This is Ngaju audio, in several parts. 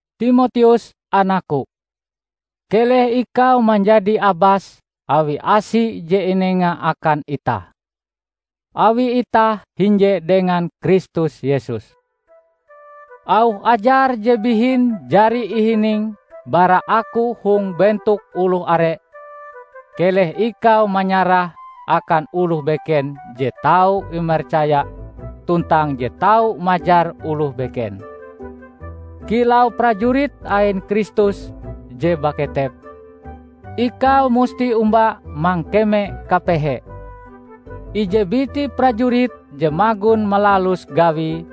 Timoteus anakku! Keleh ikau manjadi abas awi asi je inenga akan itah, awi itah hinje dengan Kristus Yesus. Auh ajar je bihin jari ihiningm bara aku hong bentok oloh are, keleh ikau manyarahe akan oloh beken je tau imercaya tuntang je tau majar oloh beken. Kilau prajurit ain Kristus je baketep, ikau musti omba mangkeme kapehe. Ije biti prajurit je magon malalus gawie,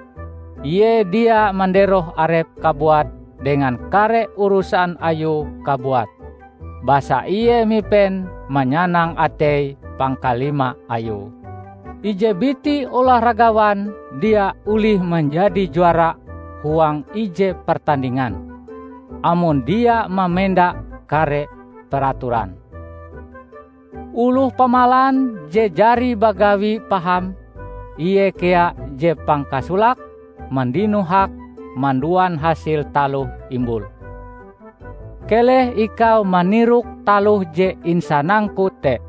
ie dia manderoh arepe kabuat dengan kare urusan ayue kabuat, basa ie mipen manyanang atei pangkalima ayue. Ije biti olahragawan dia olih manjadi juara huang ije pertandingan, amon dia mamenda kare peraturan. Oloh pamalan je jari bagawi paham, ie kea je pangkasolake mandino hak manduan hasil taloh imbule. Keleh ikau manirok taloh je insanangku te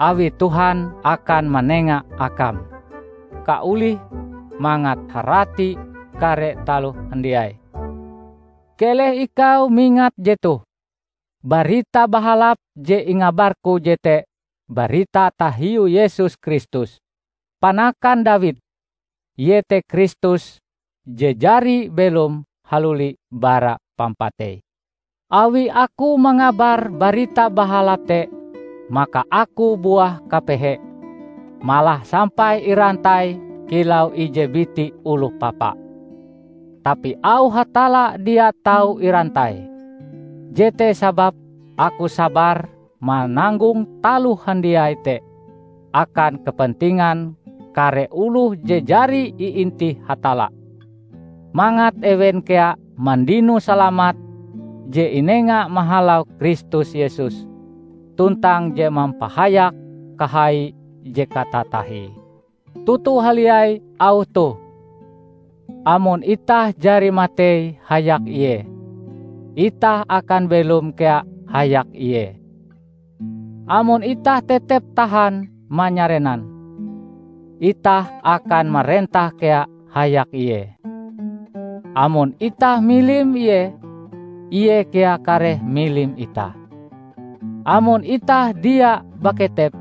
awi Tuhan akan manenga akam kaolih mangat harati kare taloh handiai. Keleh ikau mingat jetoh: Barita Bahalap je ingabarku jete barita tahiu Yesus Kristus, panakan Dawid; iete Kristus je jari belom haluli bara pampatei. Awi aku mangabar Barita Bahalap te, maka aku buah kapehe; malah sampai irantai kilau ije biti oloh papa. Tapi auh Hatalla dia tau irantai. Jete sababe aku sabar mananggong taloh handiai te akan kepentingan kare oloh je jari iintih Hatalla, mangat ewen kea mandino salamat je inenga mahalau Kristus Yesus, tuntang je mampahayak kahaie je katatahie. Toto haliai auh toh, "Amon itah jari matei hayak Ie, itah akan belom kea hayak Ie. Amon itah tetep tahan manyarenan, itah akan marentah kea hayak Ie. Amon itah milim Ie, Ie kea kareh milim itah. Amon itah dia baketep,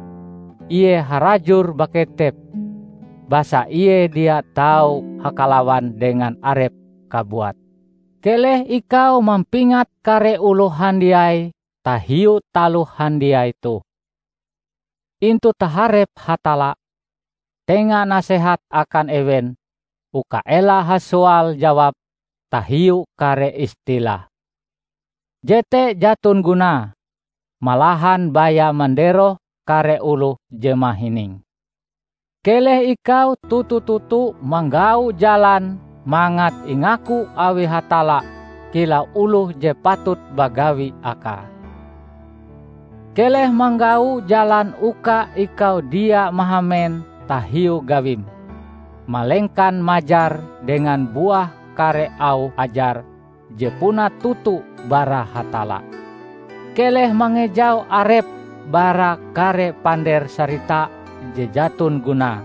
Ie harajur baketep basa Ie dia tau hakalawan dengan arepe kabuat." Keleh ikau mampingat kare oloh handiai tahiu taloh handiai toh. Intu taharep Hatalla, tenga nasehat akan ewen uka ela hasoal-jawab tahiu kare istilah. Jete jaton gunae, malahan baya manderoh kare oloh je mahininge. Keleh ikau toto-toto manggau jalan mangat ingaku awi Hatalla kilau oloh je patut bagawi akae. Keleh manggau jalan uka ikau dia mahamen tahiu gawim, malengkan majar dengan buah kare auh ajar je puna toto bara Hatalla. Keleh mangejau arepm bara kare pander sarita je jaton gunae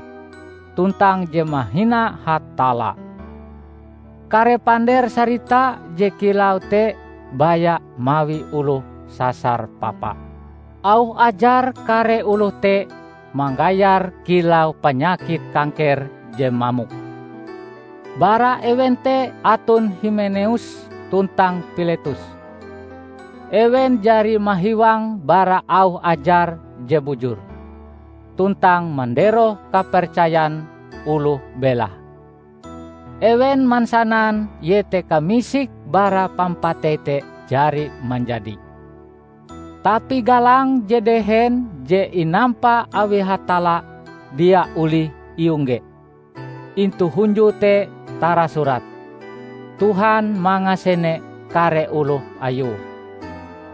tuntang je mahina Hatalla. Kare pander sarita je kilau te baya mawi oloh sasar papa. Auh ajar kare oloh te manggayar kilau panyakit kangker je mamok. Bara ewen te aton Himeneus tuntang Piletus. Ewen jari mahiwang bara auh ajar je bujur, tuntang manderoh kapercayan oloh belahe. Ewen mansanan iete kamisik bara pampatei te jari manjadi. Tapi galang je dehen je inampa awi Hatalla dia olih iongge. Intu hunjue te tarasurat, "Tuhan mangasene kare oloh Ayue",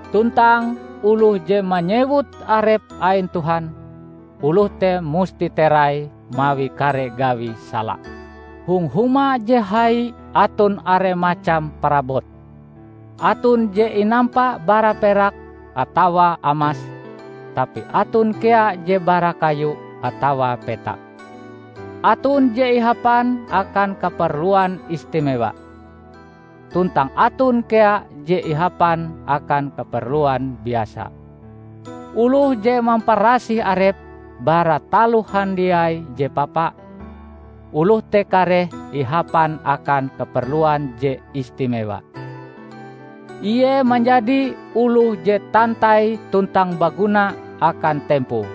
tuntang "Oloh je manyewut arepe ain Tuhan, oloh te musti terai mawi kare gawi sala". Hong huma je hai aton are macam parabot. Aton je inampa bara perak atawa amas, tapi aton kea je bara kayu atawa petak. Aton je ihapan akan kaperluan istimewa, tuntang aton kea je ihapan akan kaperluan biasa. Oloh je mamparasih arepe bara taloh handiai je papa, oloh te kareh ihapan akan kaperluan je istimewa. Ie manjadi oloh je tantai tuntang baguna akan tempoe.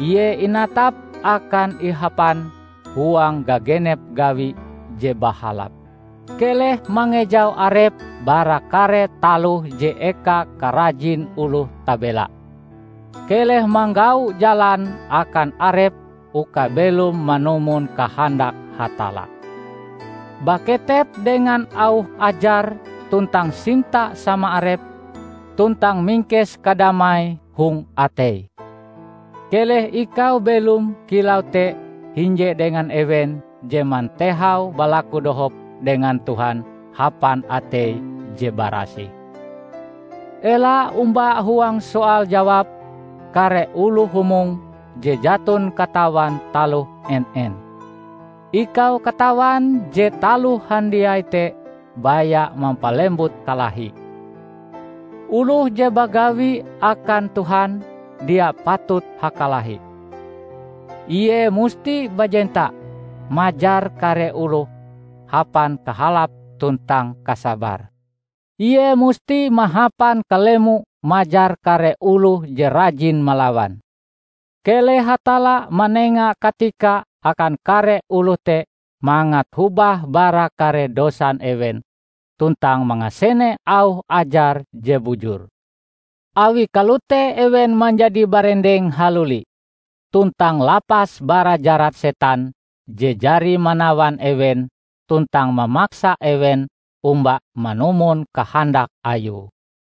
Ie inatap akan ihapan huang gagenep gawi je bahalap. Keleh mangejau arepm bara kare taloh je eka karajin oloh tabela. Keleh manggau jalan akan arepm uka belom manumon kahandak Hatalla, baketep dengan auh ajare tuntang sinta sama arep, tuntang mingkes kadamai hong atei. Keleh ikau belom kilau te hinje dengan ewen je mantehau balaku dohop dengan Tuhan hapan atei je barasih. Ela omba huang soal-jawab kare oloh humong je jaton katawan taloh en-en. Ikau katawan je taloh handiai te baya mampalembut kalahi. Oloh je bagawi akan Tuhan dia patut hakalahi; ie musti bajenta majar kare oloh hapan kahalap tuntang kasabar. Ie musti mahapan kalemo majar kare oloh je rajin malawan; keleh Hatalla manenga katika akan kare oloh te mangat hobah bara kare dosan ewen tuntang mangasene auh ajar je bujur. Awi kalote ewen manjadi barendeng haluli, tuntang lapas bara jarat setan je jari manawan ewen tuntang mamaksa ewen omba manumon kahandak ayue.